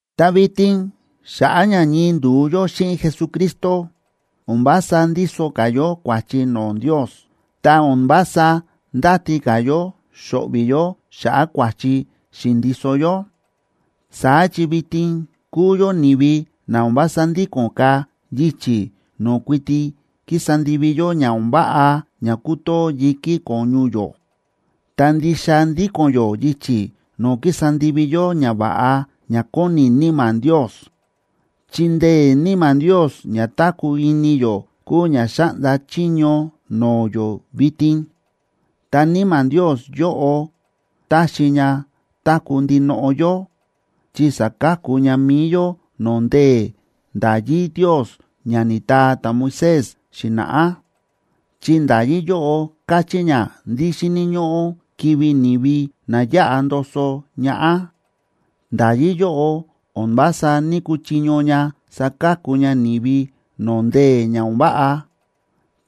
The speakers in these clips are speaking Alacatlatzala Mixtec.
Ta vitin xa̱ꞌa̱ ña ñii ndu̱u yó xíꞌin Jesucristo, o̱n vása ndíso ka̱ yó kua̱chi no̱o̱ Ndios, ta o̱n vása ndáti ka̱ yó xo̱ꞌvi̱ yó xa̱ꞌa̱ kua̱chi xi̱ndiso yó. Saá chi vitin kúu yó ni̱vi na o̱n vása ndíko̱n ka̱ yichi̱ no̱o̱ kuiti kísa ndivi yó ña o̱n váꞌa ña kútoo yi̱kí ko̱ñu yó, ta ndixa ndíko̱n yó yichi̱ no̱o̱ kísa ndivi yó ñava̱ꞌa ña kóni Níma̱ Ndios. Chi ndee̱ Níma̱ Ndios ña táku̱ ini yó kúu ña xáꞌnda chiño no̱o̱ yó vitin. Ta Níma̱ Ndios yóꞌo táxi ña táku̱ ndinoꞌo yó, chi sa̱ka̱ku ña mi̱i yó no̱o̱ ndee̱ nda̱yí Ndios ña ni̱taa ta̱Moisés xi̱na̱ꞌá, chi nda̱yí yóꞌo káchí ña ndí xíni̱ ñóꞌó kivi̱ ni̱vi na yáꞌa ndoso ñaꞌá. Nda̱yí yóꞌo o̱n vása ní‑kuchiño ña saka̱ku ña ni̱vi no̱o̱ ndee̱ ña o̱n váꞌa,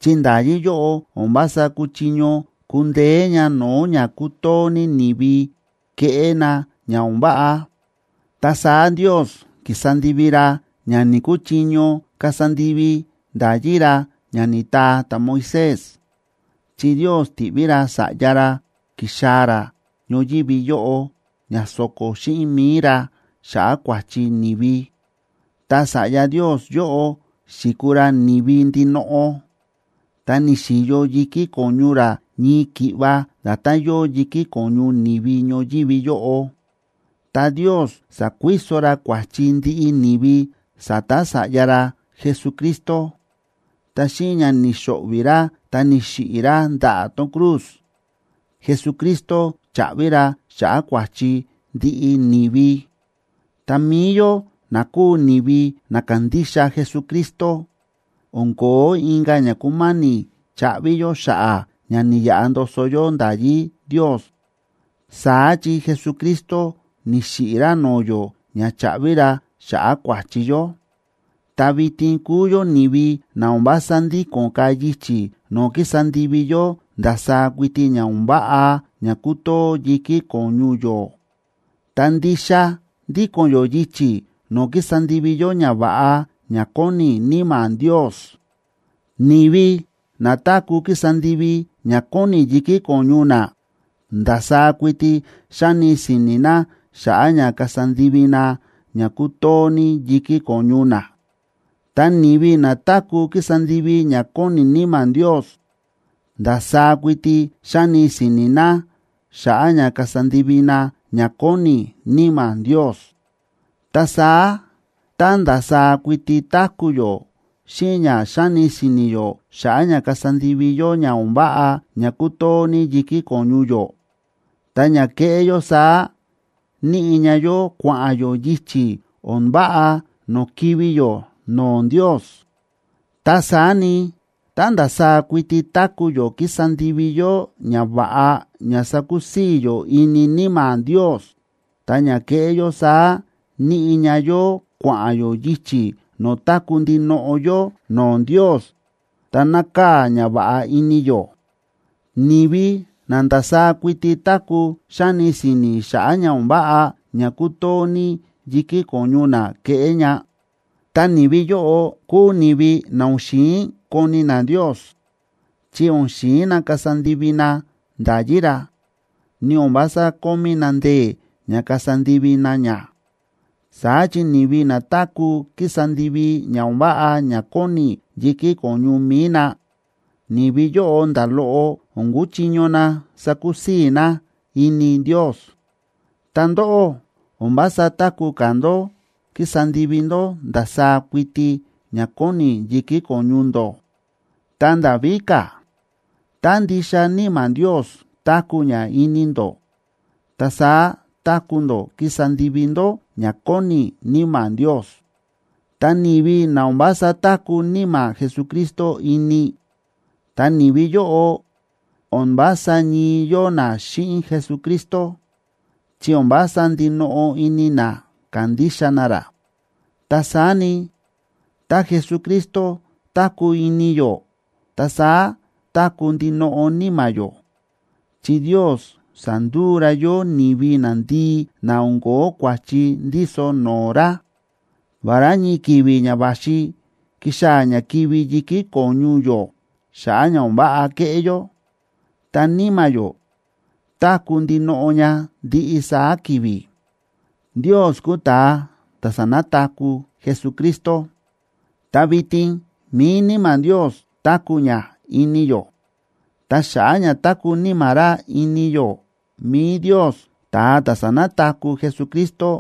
chi nda̱yí yóꞌo o̱n vása kúchiño kundeé ña no̱o̱ ña kútoo ní ni̱vi keꞌé na ña o̱n váꞌa. Ta saá Ndios ki̱sa ndivi ra ña ni̱‑kuchiño kasa ndivi nda̱yí ra ña ni̱taa ta̱Moisés, chi Ndios ti̱ꞌví ra Sa̱ꞌya ra ki̱xaa̱ ra ñoyívi yóꞌo, ña so̱ko̱ xíꞌin mi̱i ra xa̱ꞌa̱ kua̱chi ni̱vi. Ta Sa̱ꞌya Ndios yóꞌo xi̱kuu ra ni̱vi ndinoꞌo, ta ni̱xi̱yo yi̱kí ko̱ñu ra ñii ki̱ꞌva nda̱tán yóo yi̱kí ko̱ñu ni̱vi ñoyívi yóꞌo. Ta Ndios sa̱kuiso ra kua̱chi ndiꞌi ni̱vi sa̱ta̱ Sa̱ꞌya ra Jesucristo, ta xíꞌin ña ni̱xo̱ꞌvi̱ ra ta ni̱xiꞌi̱ ra ndaꞌa̱ tón cruz, Jesucristo cha̱ꞌvi ra xa̱ꞌa̱ kua̱chi ndiꞌi ni̱vi. Ta mi̱i yó na kúu ni̱vi na kándixa Jesucristo, o̱n ko̱ó inka̱ ña kúma̱ni̱ chaꞌvi yó xa̱ꞌa̱ ña ni̱yaꞌa ndoso yó nda̱yí Ndios. Saá chi Jesucristo ni̱xiꞌi̱ ra no̱o̱ yó ña cha̱ꞌvi ra xa̱ꞌa̱ kua̱chi yó. Ta vitin kúu yó ni̱vi na o̱n vása ndíko̱n ka̱ yichi̱ no̱o̱ kísa ndivi yó ndasaá kuiti ña o̱n váꞌa ña kútoo yi̱kí ko̱ñu yó, ta ndixa ndíko̱n yó yichi̱ no̱o̱ kísa ndivi yó ñava̱ꞌa ña kóni Níma̱ Ndios. Ni̱vi na táku̱ kísa ndivi ña kóni yi̱kí ko̱ñu na, ndasaá kuiti xáni si̱ni̱ na xa̱ꞌa̱ ña kasa ndivi na ña kútoo ní yi̱kí ko̱ñu na. Ta ni̱vi na táku̱ kísa ndivi ña kóni Níma̱ Ndios, ndasaá kuiti xáni si̱ni̱ na xa̱ꞌa̱ ña kasa ndivi na ña kóni Níma̱ Ndios. Ta saá tá ndasaá kuiti táku̱ yó xíꞌin ña xáni si̱ni̱ yó xa̱ꞌa̱ ña kasa ndivi yó ña o̱n váꞌa ña kútoo ní yi̱kí ko̱ñu yó, ta ña kéꞌé yó saá níꞌi ña yó kua̱ꞌa̱n yó yichi̱ o̱n váꞌa no̱o̱ kivi̱ yó no̱o̱ Ndios. Ta saá ni, tá ndasaá kuiti táku̱ yó kísa ndivi yó ñava̱ꞌa ña sakusii̱ yó ini Níma̱ Ndios, ta ña kéꞌé yó saá níꞌi ña yó kua̱ꞌa̱n yó yichi̱ no̱o̱ táku̱ ndinoꞌo yó no̱o̱ Ndios ta nákaa̱ ñava̱ꞌa ini yó. Ni̱vi na ndasaá kuiti táku̱ xáni si̱ni̱ xa̱ꞌa̱ ña o̱n váꞌa ña kútoo ní yi̱kí ko̱ñu na keꞌé ña, ta ni̱vi yóꞌo kúu ni̱vi na o̱n xi̱in koni na Ndios, chi o̱n xi̱in na kasa ndivi na nda̱yí ra, ni o̱n vása kómí na ndee̱ ña kasa ndivi na ña. Saá chi ni̱vi na táku̱ kísa ndivi ña o̱n váꞌa ña kóni yi̱kí ko̱ñu mi̱i na, ni̱vi yóꞌo nda̱ loꞌo o̱n kúchiño na sakusii̱ na ini Ndios. Ta ndóꞌó, o̱n vása táku̱ ka̱ ndó kísa ndivi ndó ndasaá kuiti ña kóni yi̱kí ko̱ñu ndó. Ta nda̱ víka̱, tá ndixa Níma̱ Ndios táku̱ ña ini ndó, ta saá táku̱ ndó kísa ndivi ndó ña kóni Níma̱ Ndios. Ta ni̱vi na o̱n vása táku̱ Níma̱ Jesucristo ini, ta ni̱vi yóꞌo o̱n vása ñii yóo na xíꞌin Jesucristo, chi o̱n vása ndinoꞌo ini na kándixa na ra. Ta saá ni, tá Jesucristo táku̱ ini yó, ta saá táku̱ ndinoꞌo níma̱ yó, chi Ndios sa̱nduu ra yó ni̱vi nandii na o̱n ko̱ó kua̱chi ndíso no̱o̱ ra. Vará ñii ki̱vi̱ ña va̱xi kixaa̱ ña kivi̱ yi̱kí ko̱ñu yó, xa̱ꞌa̱ ña o̱n váꞌa ke̱ꞌé yó, ta níma̱ yó táku̱ ndinoꞌo ña ndiꞌi saá ki̱vi̱. Ndios kúu ta̱a ta̱ sa̱nataku̱ Jesucristo, ta vitin mi̱i Níma̱ Ndios táku̱ ña ini yó. Ta xa̱ꞌa̱ ña táku̱ Níma̱ ra ini yó, mi̱i Ndios, ta̱a ta̱ sa̱nataku̱ Jesucristo,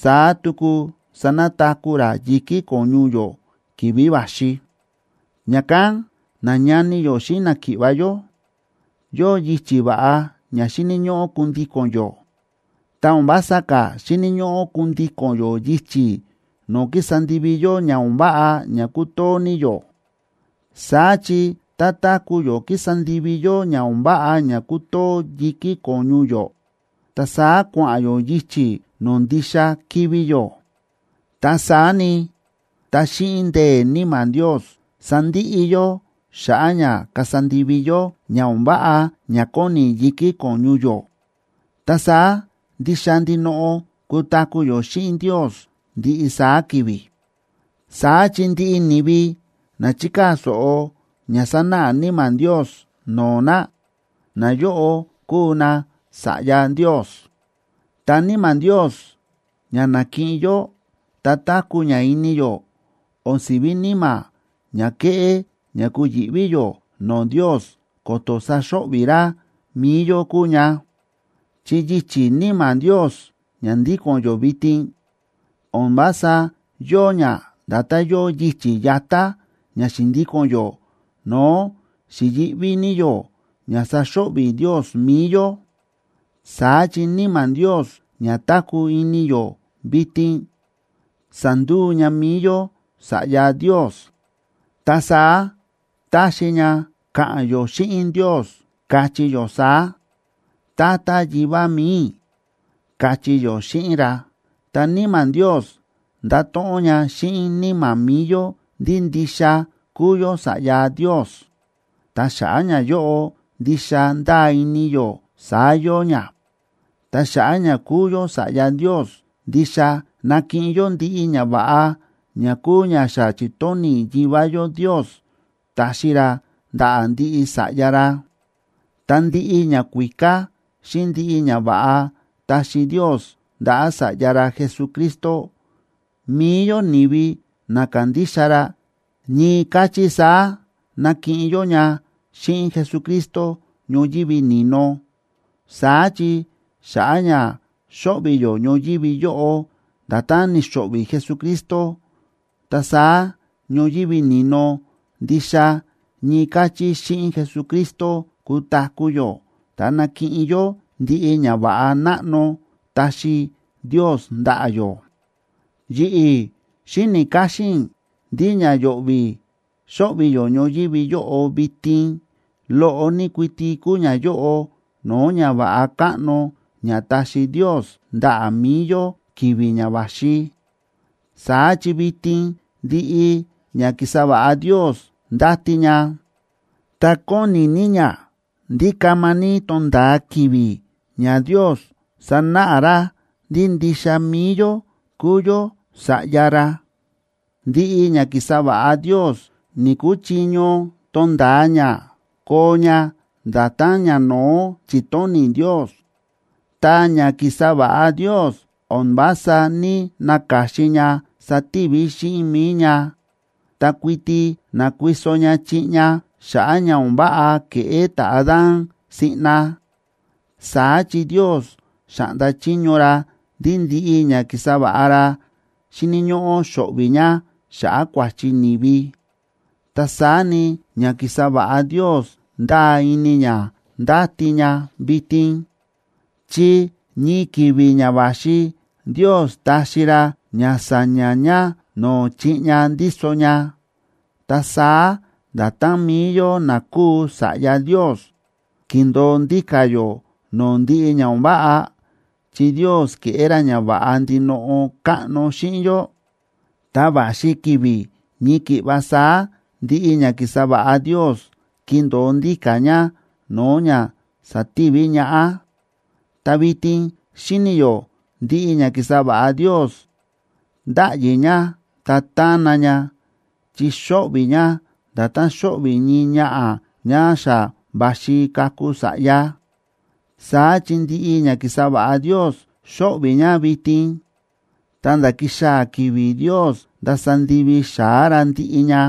saá tuku sanataku̱ ra yi̱kí ko̱ñu yó ki̱vi̱ va̱xi. Ña̱kán, nañani yó xíꞌin náki̱ꞌva̱ yó, yóo yichi̱ va̱ꞌa ña xíni̱ ñóꞌó kundíko̱n yó, ta o̱n vása ka̱ xíni̱ ñóꞌó kundíko̱n yó yichi̱ no̱o̱ kísa ndivi yó ña o̱n váꞌa ña kútoo ní yó. Saá chi tá táku̱ yó kísa ndivi yó ña o̱n váꞌa ña kútoo yi̱kí ko̱ñu yó, ta saá kua̱ꞌa̱n yó yichi̱ no̱o̱ ndixa kivi̱ yó. Ta saá ni, tá xíꞌin ndee̱ Níma̱ Ndios sandiꞌi yó xa̱ꞌa̱ ña kasa ndivi yó ña o̱n váꞌa ña kóni yi̱kí ko̱ñu yó, ta saá ndixa ndinoꞌo kutaku̱ yó xíꞌin Ndios ndiꞌi saá ki̱vi̱. Saá chi ndiꞌi ni̱vi na chíkaa̱ so̱ꞌo ña sánáꞌa Níma̱ Ndios no̱o̱ na, nayóꞌo kúu nasa̱ꞌya Ndios. Ta Níma̱ Ndios ña na̱kiꞌin yó ta táku̱ ña ini yó o̱n si̱ví níma̱ ña kéꞌé ña kuyi̱ꞌví yó no̱o̱ Ndios ko̱to̱ saxo̱ꞌvi̱ ra mi̱i yó kúu ña. Chi yichi̱ Níma̱ Ndios ña ndíko̱n yó vitin, o̱n vása yóo ña nda̱tán yóo yichi̱ yatá ña xi̱ndíko̱n yó no̱o̱ xi̱yi̱ꞌví ní yó ña saxo̱ꞌvi̱ Ndios mi̱i yó. Saá chi Níma̱ Ndios ña táku̱ ini yó vitin sa̱nduu ña mi̱i yó sa̱ꞌya Ndios. Ta saá táxi ña káꞌa̱n yó xíꞌin Ndios, káchí yó saá: “Tata Yivá mi̱i i̱”, káchí yó xíꞌin ra. Ta Níma̱ Ndios ndáto̱ꞌon ña xíꞌin níma̱ mi̱i yó ndí ndixa kúu yó sa̱ꞌya Ndios, ta xa̱ꞌa̱ ñayóꞌo ndixa ndáa ini yó saá yóo ña. Ta xa̱ꞌa̱ ña kúu yó sa̱ꞌya Ndios, ndixa nakiꞌin yó ndiꞌi ñava̱ꞌa ña kúu ña xa chi̱tóni̱ Yivá yó Ndios taxi ra ndaꞌa̱ ndiꞌi sa̱ꞌya ra. Ta ndiꞌi ñakuíká xíꞌin ndiꞌi ñava̱ꞌa ta̱xi Ndios ndaꞌa̱ Sa̱ꞌya ra Jesucristo, mi̱i yó ni̱vi na kándixa ra, ñii káchí saá nakiꞌin yó ña xíꞌin Jesucristo ñoyívi ni̱no. Saá chi xa̱ꞌa̱ ña xóꞌvi̱ yó ñoyívi yóꞌo nda̱tán ni̱xo̱ꞌvi̱ Jesucristo, ta saá ñoyívi ni̱no ndixa ñii káchí xíꞌin Jesucristo kutaku̱ yó ta nakiꞌin yó ndiꞌi ñava̱ꞌa náꞌno taxi Ndios ndaꞌa̱ yó. Yi̱ꞌi̱ xíni̱ káxín i̱ ndí ña yo̱ꞌvi̱ xóꞌvi̱ yó ñoyívi yóꞌo vitin, loꞌo ní kuiti kúu ñayóꞌo no̱o̱ ñava̱ꞌa káꞌno ña taxi Ndios ndaꞌa̱ mi̱i yó ki̱vi̱ ña va̱xi. Saá chi vitin ndiꞌi ña ki̱sa va̱ꞌa Ndios ndáti ña, ta kóni ní ña ndí kama ní tonda̱a ki̱vi̱ ña Ndios sanáꞌa ra ndí ndixa mi̱i yó kúu yó sa̱ꞌya ra. Ndiꞌi ña ki̱sa va̱ꞌa Ndios ni̱‑kuchiño tonda̱a ña koo ña nda̱tán ñano̱ó chi̱tóni̱ Ndios. Ta ña ki̱sa va̱ꞌa Ndios o̱n vása ní‑naka̱xin ña sativi xíꞌin mi̱i ña, ta kuiti nákuiso ña chiꞌña xa̱ꞌa̱ ña o̱n váꞌa ke̱ꞌé ta̱Adán siꞌna, saá chi Ndios xa̱ꞌnda chiño ra ndí ndiꞌi ña ki̱sa va̱ꞌa ra xíni̱ ñóꞌó xo̱ꞌvi̱ ña xa̱ꞌa̱ kua̱chi ni̱vi. Ta saá ni, ña ki̱sa va̱ꞌa Ndios ndáa ini ña ndáti ña vitin, chi ñii ki̱vi̱ ña va̱xi Ndios taxi ra ña sa̱ña̱ ña no̱o̱ chiꞌña ndíso ña. Ta saá nda̱tán mi̱i yó na kúu sa̱ꞌya Ndios, kíndo̱o ndíka̱ yó no̱o̱ ndiꞌi ña o̱n váꞌa, chi Ndios ke̱ꞌé ra ñava̱ꞌa ndinoꞌo káꞌno xíꞌin yó, ta va̱xi ki̱vi̱ ñii ki̱ꞌva saá ndiꞌi ña ki̱sa va̱ꞌa Ndios kindo̱o ndíka̱ ña no̱o̱ ña sa̱tivi ñaꞌá. Ta vitin xíni̱ yó ndiꞌi ña ki̱sa va̱ꞌa Ndios ndáꞌyi ña ta tána ña, chi xóꞌvi̱ ña nda̱tán xóꞌvi̱ ñii ñaꞌa̱ ñá xa va̱xi kaku sa̱ꞌya. Saá chi ndiꞌi ña ki̱sa va̱ꞌa Ndios xóꞌvi̱ ña vitin ta̱nda̱ kixaa̱ ki̱vi̱ Ndios ndasa ndivi xa̱á ra ndiꞌi ña.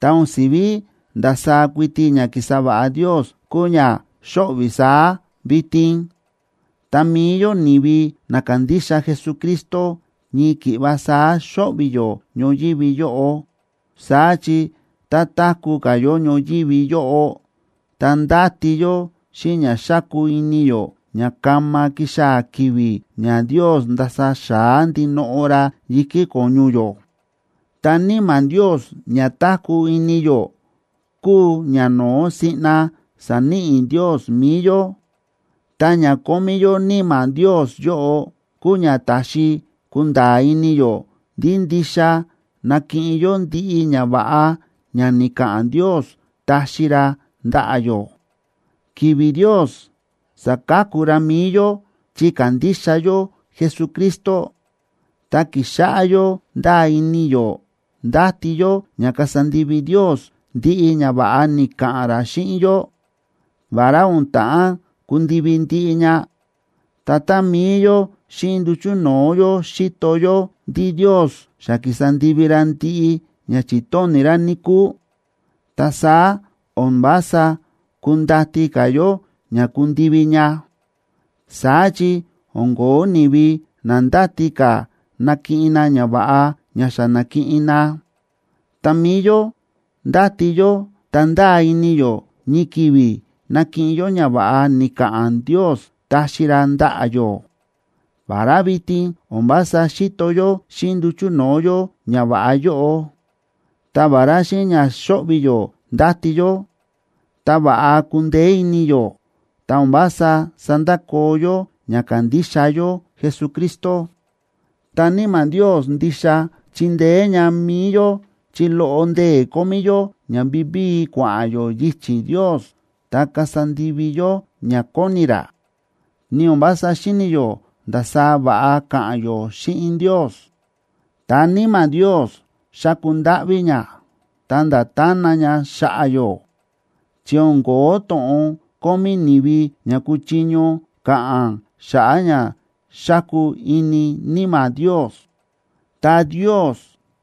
Ta o̱n si̱ví ndasaá kuiti ña ki̱sa va̱ꞌa Ndios kúu ña xóꞌvi̱ saá vitin, ta mi̱i yó ni̱vi na kándixa Jesucristo, ñii ki̱ꞌva saá xóꞌvi̱ yó ñoyívi yóꞌo. Saá chi tá táku̱ ka̱ yó ñoyívi yóꞌo, ta ndáti yó xíꞌin ña xáku ini yó ña kama kixaa̱ ki̱vi̱ ña Ndios ndasa xa̱á ndinoꞌo ra yi̱kí ko̱ñu yó. Ta Níma̱ Ndios ña táku̱ ini yó, kúu ña no̱ó siꞌna sa̱níꞌi Ndios mi̱i yó, ta ña kómí yó Níma̱ Ndios yóꞌo kúu ña táxi kunda̱a̱ ini yó ndí ndixa nakiꞌin yó ndiꞌi ñava̱ꞌa ña ni̱ka̱ꞌa̱n Ndios taxi ra ndaꞌa̱ yó. Ki̱vi̱ Ndios sa̱ka̱ku ra mi̱i yó chi ka̱ndixa yó Jesucristo, ta ki̱xáꞌá yó ndáa ini yó ndáti yó ña kasa ndivi Ndios ndiꞌi ñava̱ꞌa ni̱ka̱ꞌa̱n ra xíꞌin yó, vará o̱n ta̱ꞌán kundivi ndiꞌi ña. Ta tá mi̱i yó xíꞌin nduchu̱ no̱o̱ yó xíto yó ndí Ndios xa ki̱sa ndivi ra ndiꞌi ña chi̱tóni̱ ra, níkúu, ta saá o̱n vása kundati ka̱ yó ña kundivi ña. Saá chi o̱n ko̱ó ni̱vi na ndáti ka̱ nakiꞌin na ñava̱ꞌa ña xa na̱kiꞌin na. Ta mi̱i yó ndáti yó ta ndáa ini yó ñii ki̱vi̱ nakiꞌin yó ñava̱ꞌa ni̱ka̱ꞌa̱n Ndios taxi ra ndaꞌa̱ yó, vará vitin o̱n vása xíto yó xíꞌin nduchu̱ no̱o̱ yó ñava̱ꞌa yóꞌo. Ta vará xíꞌin ña xóꞌvi̱ yó ndáti yó, ta va̱ꞌa kúndeé ini yó, ta o̱n vása sándakoo yó ña kándixa yó Jesucristo. Ta Níma̱ Ndios ndixa chíndeé ña mi̱i yó chi loꞌo ndee̱ kómí yó ña vivíi kua̱ꞌa̱n yó yichi̱ Ndios ta kasa ndivi yó ña kóni ra, ni o̱n vása xíni̱ yó ndasaá va̱ꞌa ka̱ꞌa̱n yó xíꞌin Ndios. Ta Níma̱ Ndios xáku ndáꞌví ña, ta̱nda̱ tána ña xa̱ꞌa̱ yó, chi o̱n ko̱ó to̱ꞌon kómí ni̱vi ña kuchiño ka̱ꞌa̱n xa̱ꞌa̱ ña xáku ini Níma̱ Ndios. Ta Ndios,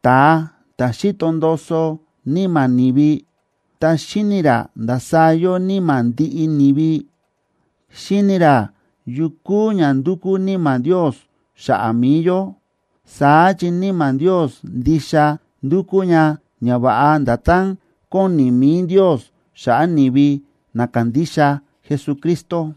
ta̱a ta̱ xíto ndoso níma̱ ni̱vi ta xíni̱ ra ndasaá yóo níma̱ ndiꞌi ni̱vi, xíni̱ ra yu kúu ña ndúkú Níma̱ Ndios xa̱ꞌa̱ mi̱i yó. Saá chi Níma̱ Ndios ndixa ndúkú ña ñava̱ꞌa nda̱tán kóni mi̱i Ndios xa̱ꞌa̱ ni̱vi na kándixa Jesucristo.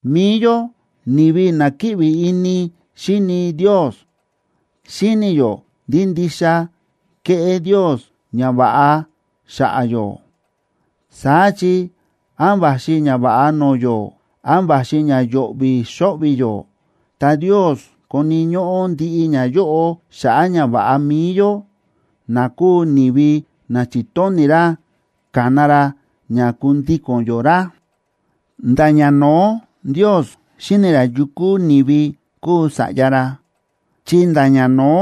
Mi̱i yó ni̱vi na kíꞌvi ini xíni Ndios, xíni yó ndí ndixa kéꞌé Ndios ñava̱ꞌa xa̱ꞌa̱ yó. Saá chi án va̱xi ñava̱ꞌa no̱o̱ yó, án va̱xi ña yo̱ꞌvi̱ xo̱ꞌvi̱ yó, ta Ndios koni̱ ñóꞌó ndiꞌi ñayóꞌo xa̱ꞌa̱ ñava̱ꞌa mi̱i yó, na kúu ni̱vi na chi̱tóni̱ ra kana ra ña kundíko̱n yó ra. Nda̱ ñano̱ó Ndios xíni̱ ra yu kúu ni̱vi kúu sa̱ꞌya ra, chi nda̱ ñano̱ó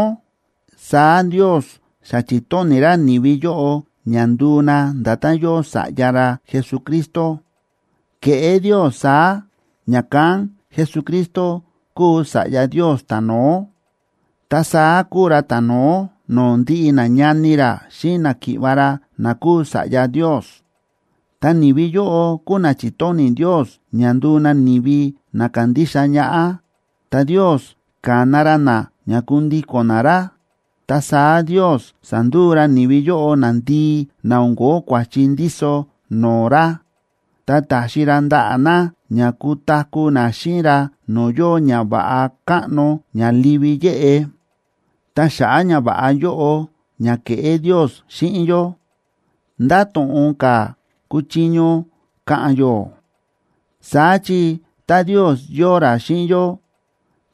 saá Ndios xa chi̱tóni̱ ra ni̱vi yóꞌo ña nduu na nda̱tán yóo Sa̱ꞌya ra Jesucristo. Ke̱ꞌé Ndios saá, ña̱kán Jesucristo kúu Sa̱ꞌya Ndios ta̱no̱ó, ta saá kúu ra ta̱no̱ó no̱o̱ ndiꞌi nañani ra xíꞌin náki̱ꞌva̱ ra na kúu sa̱ꞌya Ndios. Ta ni̱vi yóꞌo kúu na chi̱tóni̱ Ndios ña nduu na ni̱vi na kandixa ñaꞌá, ta Ndios ka̱na ra na ña kundíko̱n na ra. Ta saá Ndios sa̱nduu ra ni̱vi yóꞌo nandii na o̱n ko̱ó kua̱chi ndíso no̱o̱ ra, ta taxi ra ndaꞌa̱ na ña kutaku̱ na xíꞌin ra no̱o̱ yóo ñava̱ꞌa káꞌno ña livi yéꞌe. Ta xa̱ꞌa̱ ñava̱ꞌa yóꞌo ña kéꞌé Ndios xíꞌin yó, ¿ndá to̱ꞌon ka̱ kúchiño ka̱ꞌa̱n yó? Saá chi tá Ndios yóo ra xíꞌin yó,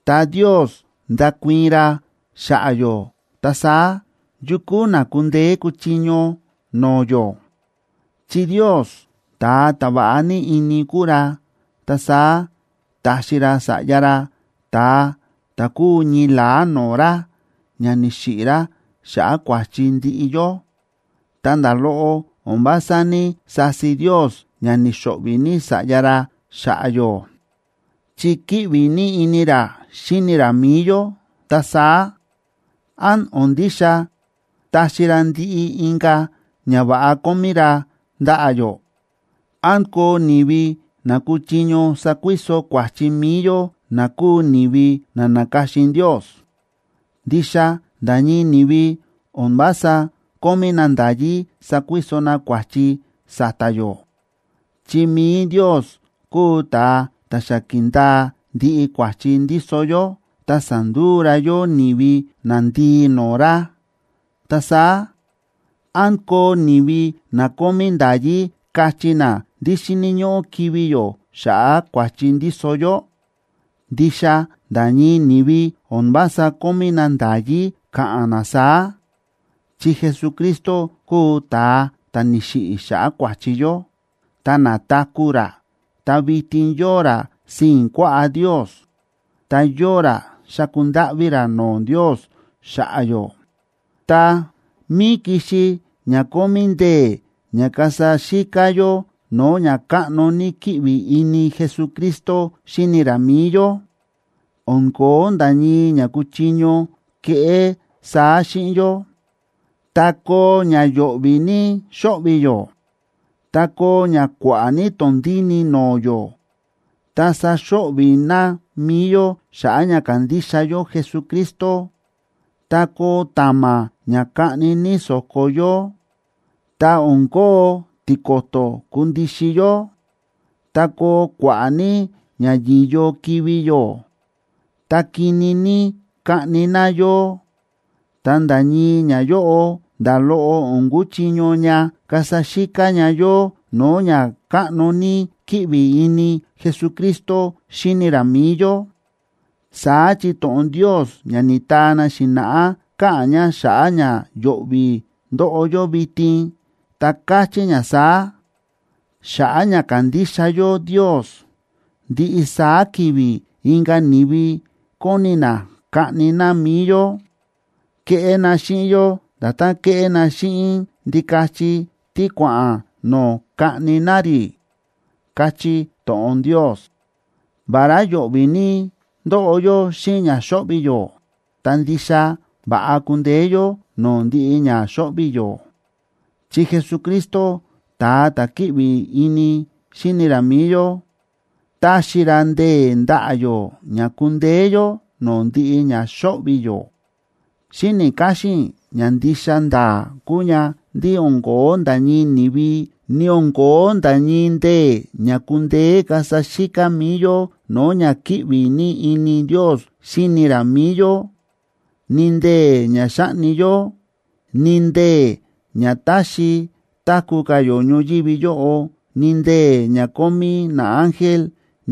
ta Ndios ndákuii̱n ra xa̱ꞌa̱ yó, ta saá, ¿yu kúu na kundeé kuchiño no̱o̱ yó? Chi Ndios ta̱a ta̱ va̱ꞌa ní ini kúu ra, ta saá ta̱xi ra Sa̱ꞌya ra, ta̱a ta̱ kúu ñii la̱á no̱o̱ ra, ña ni̱xiꞌi̱ ra xa̱ꞌa̱ kua̱chi ndiꞌi yó. Tá nda̱ loꞌo o̱n vása ní‑sasi Ndios ña ni̱xo̱ꞌvi̱ ní Sa̱ꞌya ra xa̱ꞌa̱ yó, chi kíꞌvi ní ini ra xíni ra mi̱i yó, ta saá, ¿án o̱n ndixa taxi ra ndiꞌi inka̱ ñava̱ꞌa kómí ra ndaꞌa̱ yó? ¿Án koo ni̱vi na kuchiño sakuiso kua̱chi mi̱i yó na kúu ni̱vi na na̱ka̱xin Ndios? Ndixa nda̱ ñii ni̱vi o̱n vása kómí na nda̱yí sakuiso na kua̱chi sa̱ta̱ yó, chi mi̱i Ndios kúu ta̱a ta̱ xa ki̱ndaa ndiꞌi kua̱chi ndíso yó, ta sa̱nduu ra yó ni̱vi nandii no̱o̱ ra. Ta saá, ¿án koo ni̱vi na kómí nda̱yí kachí na ndí xíni̱ ñóꞌó kivi̱ yó xa̱ꞌa̱ kua̱chi ndíso yó? Ndixa nda̱ ñii ni̱vi o̱n vása kómí na nda̱yí ka̱ꞌa̱n na saá, chi Jesucristo kúu ta̱a ta̱ ni̱xiꞌi̱ xa̱ꞌa̱ kua̱chi yó, ta na̱taku̱ ra, ta vitin yóo ra sii̱n kuaꞌá Ndios, ta yóo ra xáku ndáꞌví ra no̱o̱ Ndios xa̱ꞌa̱ yó. Ta, ¿mí kixi ña kómí ndee̱ ña kasa xíká yó no̱o̱ ña káꞌno ní kíꞌvi ini Jesucristo xíni ra mi̱i yó? ¡O̱n ko̱ó nda̱ ñii ña kuchiño keꞌé saá xíꞌin yó! Tá koo ña yo̱ꞌvi̱ ní xo̱ꞌvi̱ yó, tá koo ña kua̱ꞌa̱ ní tondíni no̱o̱ yó, tá saxo̱ꞌvi̱ na mi̱i yó xa̱ꞌa̱ ña kándixa yó Jesucristo, tá koo ta̱ma̱ ña kaꞌni ní so̱ko yó, tá o̱n kóo tiko̱to̱ kundixin yó, tá koo kua̱ꞌa̱ ní ña yi̱yo kivi̱ yó, tá kini ní kaꞌni na yó, ta nda̱ ñii ñayóꞌo, nda̱ loꞌo o̱n kuchiño ña kasa xíká ña yó no̱o̱ ña káꞌno ní kíꞌvi ini Jesucristo xíni ra mi̱i yó. Saá chi to̱ꞌon Ndios ña ni̱taa na xi̱na̱ꞌá káꞌa̱n ña xa̱ꞌa̱ ña yo̱ꞌvi̱ ndóꞌo yó vitin, ta káchí ña saá: Xa̱ꞌa̱ ña kándixa yó Ndios, ndiꞌi saá ki̱vi̱ inka̱ ni̱vi kóni na kaꞌni na mi̱i yó. Kéꞌé na xíꞌin yó nda̱tán kéꞌé na xíꞌin ndikachi tí kua̱ꞌa̱n no̱o̱ kaꞌni na rí, káchí to̱ꞌon Ndios. Vará yo̱ꞌvi̱ ní ndóꞌo yó xíꞌin ña xóꞌvi̱ yó, ta ndixa va̱ꞌa kúndeé yó no̱o̱ ndiꞌi ña xóꞌvi̱ yó, chi Jesucristo, ta̱a ta̱ kíꞌvi ini xíni ra mi̱i yó, táxi ra ndee̱ ndaꞌa̱ yó ña kúndeé yó no̱o̱ ndiꞌi ña xóꞌvi̱ yó. Xíni̱ káxín i̱ ña ndixa nda̱a̱ kúu ña ndí o̱n ko̱ó nda̱ ñii ni̱vi, ni o̱n ko̱ó nda̱ ñii ndee̱ ña kundeé kasa xíká mi̱i yó no̱o̱ ña kíꞌvi ní ini Ndios xíni ra mi̱i yó. Ni ndee̱ ña xáꞌni yó, ni ndee̱ ña táxi táku̱ ka̱ yó ñoyívi yóꞌo, ni ndee̱ ña kómí naángel,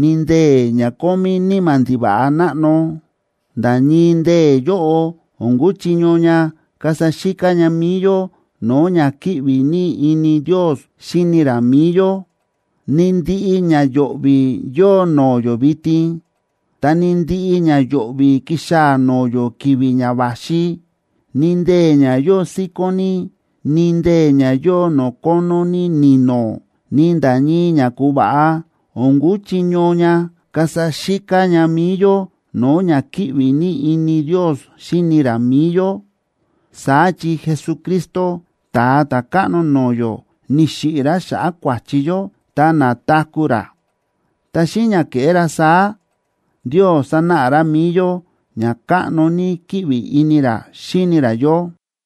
ni ndee̱ ña kómí níma̱ ndiva̱ꞌa náꞌno, nda̱ ñii ndee̱ yóꞌo o̱n kúchiño ña kasa xíká ña mi̱i yó no̱o̱ ña kíꞌvi ní ini Ndios xíni ra mi̱i yó. Ni ndiꞌi ña yo̱ꞌvi̱ yóo no̱o̱ yó vitin, ta ni ndiꞌi ña yo̱ꞌvi̱ kixaa̱ no̱o̱ yó ki̱vi̱ ña va̱xi, ni ndee̱ ña yóo síkón ní, ni ndee̱ ña yóo no̱o̱ kónó ní ni̱no̱, ni nda̱ ñii ña ku̱va̱ꞌa, o̱n kuchiño ña kasa xíká ña mi̱i yó no̱o̱ ña kíꞌvi ní ini Ndios xíni ra mi̱i yó. Saá chi Jesucristo, Ta̱a Ta̱káꞌno no̱o̱ yó, ni̱xiꞌi̱ ra xa̱ꞌa̱ kua̱chi yó ta na̱taku̱ ra. Ta xíꞌin ña ke̱ꞌé ra saá Ndios sa̱náꞌa ra mi̱i yó ña káꞌno ní kíꞌvi ini ra xíni ra yó.